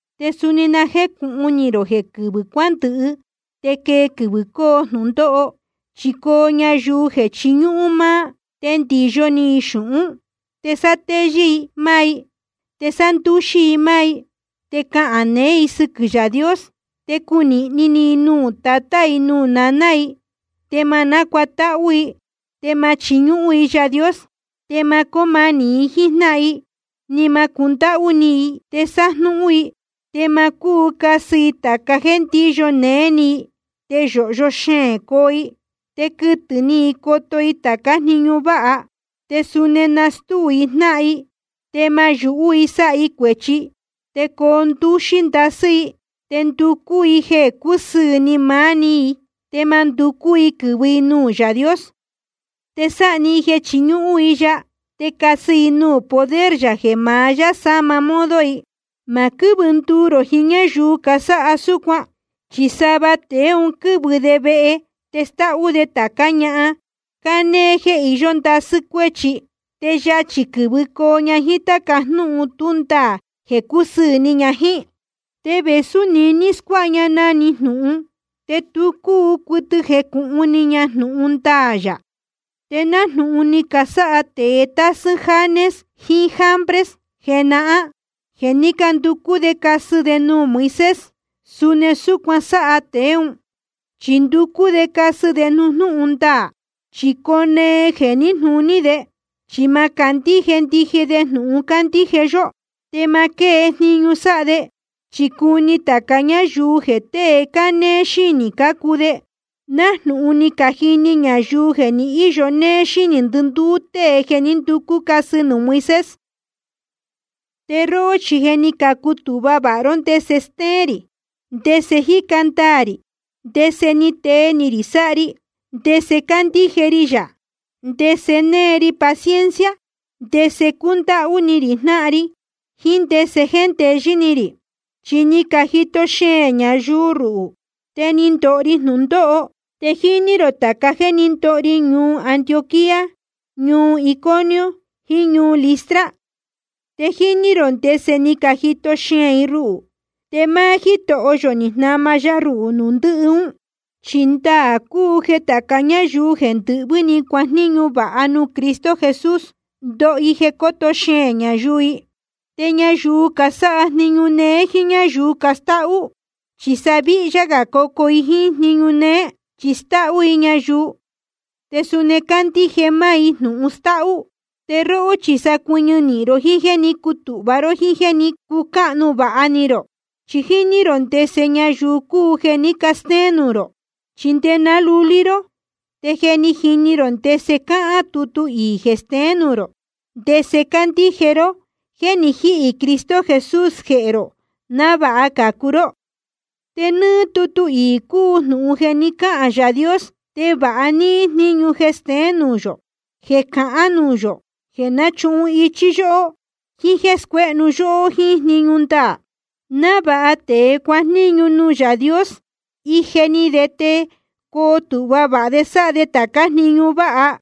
Te suni na jécūhun ni rō jeē quɨvɨ̄ cuándɨhɨ te quee quɨvɨ̄ coo jnūndóho. Chi coo ñayuu jeē chiñúhún máá, te ndiyo ni i xūhún, te sátéyɨ́ i máá i, te sándúxí i máá i. Te cahān neé i sɨquɨ̄ Yaā Dios, te cunīhni ni i nuū tatá i nuū naná i, te ma nácuatáhú i, te ma chiñúhún i Yaā Dios. Te ma cóo manī i jíín jnáhan i ni ma cundáhú ni i. Te sájnúhún i, te ma cúu casɨ i tāca jéē ndíyo néé ni i, te yōhyo xeēn coo i, te quɨtɨ ni i coto i tācá jniñu váha. Te suni nastúu i jnáhan i, te ma yūhú i sáha i cuēchi, te coo ndúxí ndasɨ́ i, te nducú i jeē cúsɨɨ̄ ni maá‑ni i, te ma nducú i quɨ̄vɨ i nuū Yaā Dios. Te sáha‑ni i jeē chiñúhún i ya, te casɨ i nuū poder yā jeē ma sáma modo i. Ma quɨ́vɨ nduu rō jiín ñáyuu casáha súcuan. Chi sava tēe ún quɨ̄vɨ de vehe te stáhú de tācá ñahan cánéé jéē iyó ndasɨ́ cuéchi. Te yachī quɨ̄vɨcoo ña jíín táca jnúhun tú ndaā jeē cúsɨɨ̄ ni ña jíín. Te vēsú niní scuáha ña na‑ni jnūhun, te tu cúu cuɨtɨ jecūhun ni ña jnūhun ndaā yā. Te nájnūhun ni casáha tēe tásɨ́ Janes jiín Jambres jenahán, jeē ní canducú de casɨ de nuū Moisés, suni súcuan sáha tēe ún, chi nducú de casɨ de nuū jnúhun ndaā. Chi coo nee jeē níjnūní de, chi ma candíje ndije de jnūhun cándíje yó. Te ma quée jniñu sáha de, chi cuni tāca ñáyuu jeē tée cánéé xínī cácuu de, nájnūhun ni cajini ñayuu jeē ni íyo néé xínī ndɨndúú tée jeē ní nducú casɨ nuū Moisés. Te róhó chi je ni cutūhva vāha ró ndese stéén rī, ndese jíca ndaā rī, ndese tée ni rī sáha ri, ndese cándíje ri yā, ndese née ri paciencia, ndese cúndáhú ni rī jnáhan ri, jiín ndese jéndeyɨ́ ni rī. Chi ni cajito xeēn ñayuu ruhū, te ni ndoho ri jnūndóho. Te jíní rō tāca jéē ní ndoho ri ñuu Antioquía, ñuu Iconio, jiín ñuu Listra. Te jíní rō ndese ni cajito xeēn i ruhū. Te máá Jítoho yō ni jnama ya ruhū nuū ndɨhɨ ún. Chi ndaā cúu jeē tāca ñáyuu jeē ndɨhvɨ́ ni cuajníñu vāha nuū Cristo Jesús, ndoho i jeē coto xeēn ñayuu i. Te ñayuu casáha jniñu néé jíín ñáyuu castáhú, chi sa víhyá gā cocuu i jíín jniñu néé, chi stáhú i ñayuu, te suni candíje máá i jnūhun stáhú. Te róhó chi sa cuɨñɨ nīhin ró jiín jéē ní cutūhva ró jíín jéē ní cucáhnu vāha ni rō. Chi jíní rō ndese ñayuu cúu jeē ní castéén nuū rō. Chi nde ná lulí ró, te je jíní rō ndese cáhán tutu iī jeē steén nuū rō ndese candíje ró jeē ni jíhī Cristo Jesús jehē rō návāha cācu ró. Te nɨ́ɨ́ tutu iī cúu jnūhun jeē ni cáhān Yaā Dios, te vāha níhín jníñu jeē steén nuū yō, jeē cahán nuū yō, jeē náchuhun ichí yóhó, jíín jéē scuéhnu yóhó jíín jniñu ndaā, návāha tēe cájejníñu nuū Yaā Dios, ije ni de te coo tūhva vāha de sáha de tācá jniñu váha.